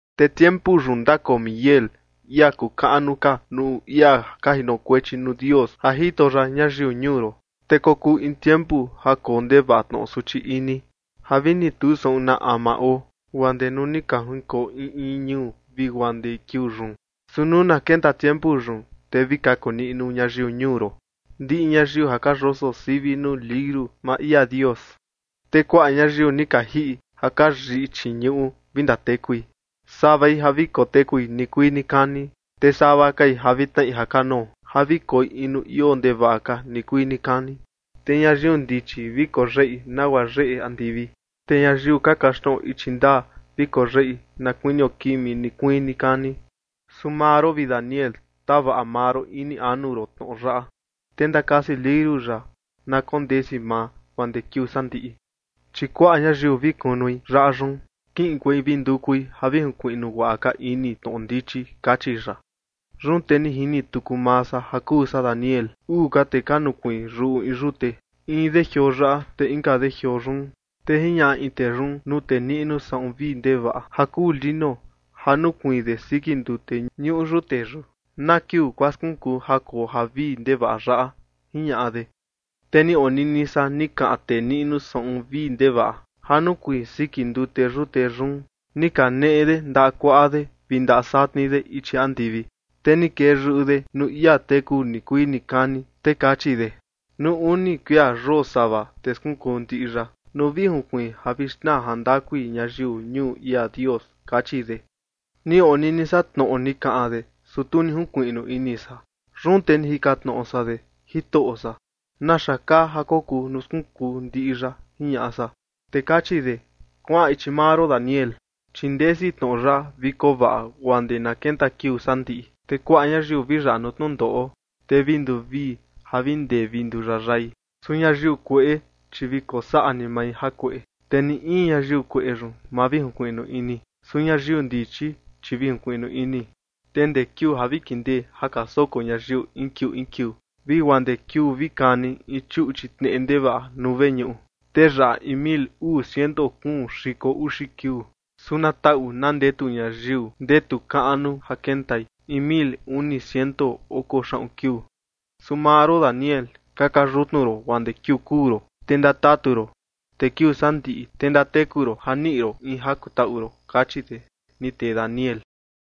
’Te tiempu yun ndakoo Miguel, ia kuu kaꞌnu ka nuu ia ka jinokuechi nuu Dios ja jito ya ñayiu ñuu ron. Te kokuu in tiempu ja koo ndevaꞌa tnoꞌo suchi ini, ja vi ni tu saꞌun na ama oo, guaa ndee nuu ni ka jinkoo in in ñuu, vi guaa ndee kiuu yun. Su nuu na kenta tiempu yun, te vi kaku niꞌnu ñayiu ñuu ron, ndiꞌi ñayiu ja ka yoso sivi nuu liuru maa ia Dios. Te kuaꞌa ñayiu ni ka jiꞌi ja ka yiꞌi chii ñuꞌu vi ndatekui, savai ja vi kotekui nikuii nikani, te sava kai ja vi tnaꞌi jakanoo, ja vi koi in nuu ioo ndevaꞌa ka nikuii nikani. Te ñayiu ndichi vi koyeꞌi, nagua yeꞌe ndika andivi. Te ñayiu ka kaxtnoꞌo ichi ndaa, vi koyeꞌi na kuinio kimi nikuii nikani. ’Su maa ron, vi Daniel, tavaꞌa maa ron ini anu ron tnoꞌo yaꞌa, te ndakasi liuru yaꞌa na kondesi maa, guaa ndee kiuu sandiꞌi. Chi kuaꞌa ñayiu vi kunui yaꞌa yun, kiꞌinkuei vi ndukui ja vi junkuiꞌnu guaꞌa ka ini tnoꞌo ndichi ―kachi ya. Yun te ni jini tuku maa san ja kuu san Daniel, uu ka tee ka nukuiin yuꞌu in yute, in de jioo yaꞌa, te inka de jioo yun. Te jiñaꞌa in tee yun nuu tee niꞌnu saꞌun vii ndevaꞌa ja kuu lino, ja nukuiin de siki ndute ñuꞌu yute yun: ―¿Na kiuu guaa skunkuu ja koo javii ndevaꞌa yaꞌa? ―jiñaꞌa de. Te ni onini san ni kaꞌan tee niꞌnu saꞌun vii ndevaꞌa ja nukuiin siki ndute yute yun. Ni kaneꞌe de ndaꞌa kuaꞌa de vi ndaꞌa satni de ichi andivi, te ni kee yuꞌu de nuu ia teku nikuii nikani, te kachi de: ―Nuu uni kuia yosava, te skunkuu ndiꞌi yaꞌa, nuu vi junkuiin ja vi xnaa jandakui ñayiu ñuu ia Dios ―kachi de. Ni onini san tnoꞌo ni kaꞌan de, su tu ni junkuiꞌnu ini san. Yun te ni jikan tnoꞌo san de: ―Jitoꞌo san, ¿naxa kaa ja kokuu nuu skunkuu ndiꞌi yaꞌa? ―jiñaꞌa san. Te kachi de: ―Kuaꞌan ichi maa ron, Daniel, chi ndesi tnoꞌo yaꞌa vi koo vaꞌa guaa ndee na kenta kiuu sandiꞌi. Te kuaꞌa ñayiu vi yaꞌa nuu tnundoꞌo, te vi nduvii ja vi ndee vi nduyayai. Su ñayiu kueꞌe, chi vi kosaꞌa ni mai jakueꞌe, te ni in ñayiu kueꞌe yun, ma vi junkuiꞌnu ini. Su ñayiu ndichi, chi vi junkuiꞌnu ini. Te ndee kiuu ja vi kindee ja ka soko ñayiu in kiuu in kiuu, vi guaa ndee kiuu vi kani in chuꞌchi tneꞌe ndevaꞌa nuu veñuꞌu, te yaꞌa in mil uu ciento kuun xiko uxi kiuu. Su na taꞌu na ndetu ñayiu ndetu kaꞌnu ja kentai in mil uni ciento oko xaꞌun kiuu. ’Su maa ron, Daniel, kaka yutnu ron guaa ndee kiuu kuu ron, te ndatatu ron. Te kiuu sandiꞌi, te ndateku ron ja niꞌi ron in ja kutaꞌu ron ―kachi de, ni tee Daniel.